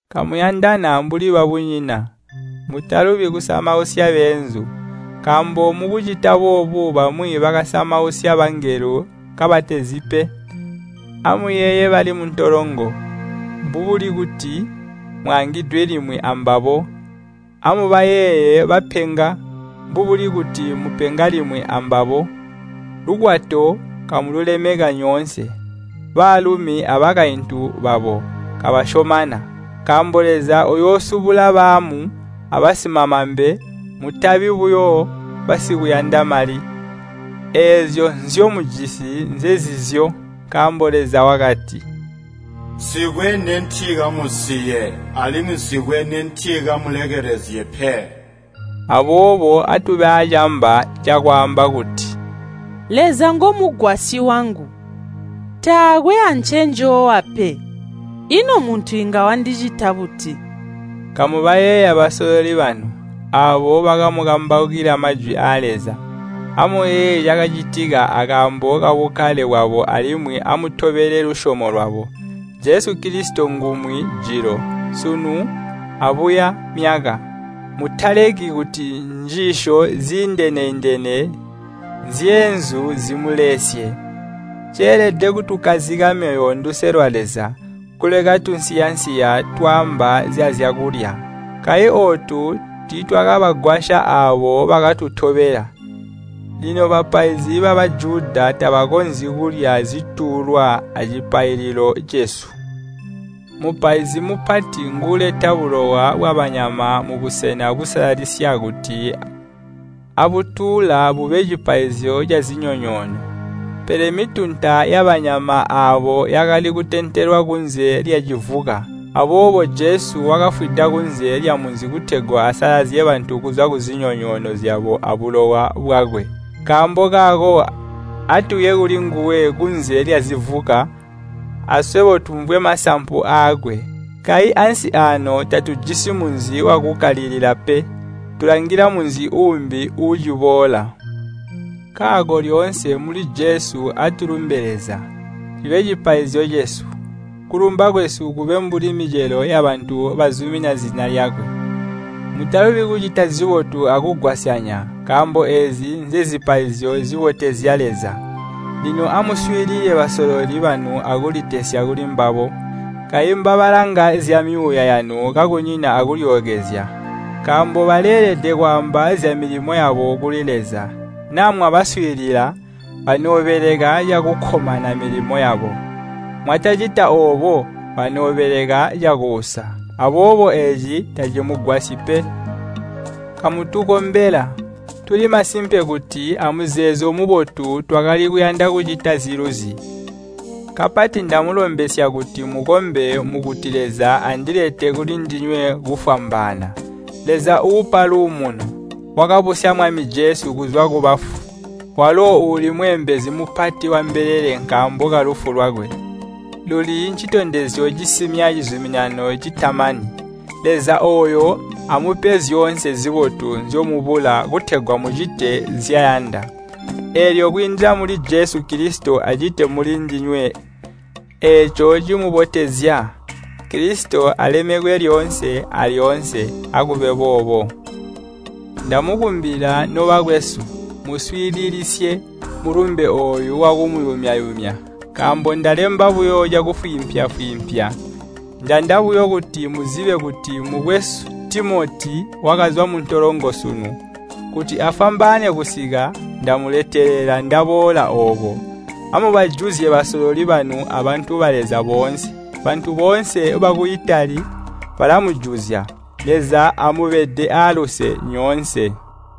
Kamuyandana mbuli babunyina. Mutalubi kusamausya beenzu, nkaambo mukucita boobo bamwi bakasamausya bangelo kabatazi pe. Amuyeeye bali muntolongo, mbubuli kuti mwaangidwe limwi ambabo. Amubayeeye bapenga, mbubuli kuti mupenga limwi ambabo. Lukwato kamululemeka nyoonse, baalumi abakaintu babo kabasyomana, nkaambo Leza uyoosubula baamu abasimamambe. Mutabi buyo basikuyanda mali. Eezyo nzyomujisi nzenzizyo. Nkaambo Leza wakati, “Nsikwe nentikamusiye, alimwi nsikwe nentikamulekelezye pe.” Aboobo atube aacamba cakwaamba kuti, “Leza ngomugwasyi wangu, taakwe ancenjoowa pe. Ino muntu inga wandicita buti?” Kamubayeeya basololi banu, aabo bakamukambaukila Majwi aa Leza. Amuyeeye cakacitika akaambo kabukkale bwabo alimwi amutobele lusyomo lwabo. Jesu Kilisito ngumwi jilo, sunu, abuya myaka. Mutaleki kuti njiisyo ziindene-indene zyeenzu zimuleesye. Ceelede kutukkazika myoyo nduse lwa Leza, kuleka tunsiya-nsiya twaamba zyazyakulya. Kayi ootu tiitwakabagwasya aabo bakatutobela. Lino bapaizi ba Bajuda tabakonzyi kulya zituulwa acipaililo cesu. Mupaizi Mupati nguuleta bulowa bwabanyama mubusena busalalisya kuti abutuula bube cipaizyo cazinyonyoono, pele mitunta yabanyama aabo yakali kutentelwa kunze lyazivuka. Aboobo Jesu wakafwida kunze lyamunzi kutegwa asalazye bantu kuzwa kuzinyonyoono zyabo abulowa bwakwe. Nkaambo kaako atuye kulinguwe kunze lyazivuka, aswebo tumvwe masampu aakwe. Kayi ansi aano tatujisi munzi wakukkalilila pe, tulangila munzi uumbi uuciboola. Nkaako lyoonse muli Jesu atulumbe Leza, cibe cipaizyo cesu. Kulumba kwesu kube mbuli micelo yabantu bazumina zina lyakwe. Mutalubi kucita zibotu akugwasyanya, nkaambo eezi nzezipaizyo zibotezya Leza. Lino amuswiilile basololi banu akulitesya kuli mbabo. Kayi mbabalanga zyamyuuya yanu kakunyina akulyookezya, nkaambo baleelede kwaamba zyamilimo yabo kuli Leza. Naa mwabaswiilila, banoobeleka cakukkomana milimo yabo. Mwatacita oobo banoobeleka cakuusa, aboobo eeci tacikamugwasyi pe. Kamutukombela. Tuli masimpe kuti amuzeezo mubotu twakali kuyanda kucita ziluzi. Kapati ndamulombesya kuti mukombe mukuti Leza andilete kulindinywe kufwambaana. Leza uupa luumuno, wakabusya Mwami Jesu kuzwa kubafu, walo uuli Mweembezi mupati wambelele nkaambo kalufu lwakwe, luli ncitondezyo cisimya cizuminano citamani, Leza ooyo amupe zyoonse zibotu nzyomubula kutegwa mucite nzyayanda. Eelyo kwiindila muli Jesu Kilisito acite muli ndinywe eeco cimubotezya. Kilisito alemekwe lyoonse alyoonse! Akube boobo. Ndamukumbila nobakwesu, muuswiililisye mulumbe ooyu wakuyumya-yumya, nkaambo ndalemba buyo cakufwiimpya-fwiimpya. Njanda buyo kuti muzibe kuti mukwesu Timoti wakazwa muntolongo sunu. Kuti afwambaane kusika, ndamuletelela ndaboola ooko. Amubajuzye basololi banu abantu ba Leza boonse. Bantu boonse baku Itali balamujuzya. Leza amubede aaluse nyoonse.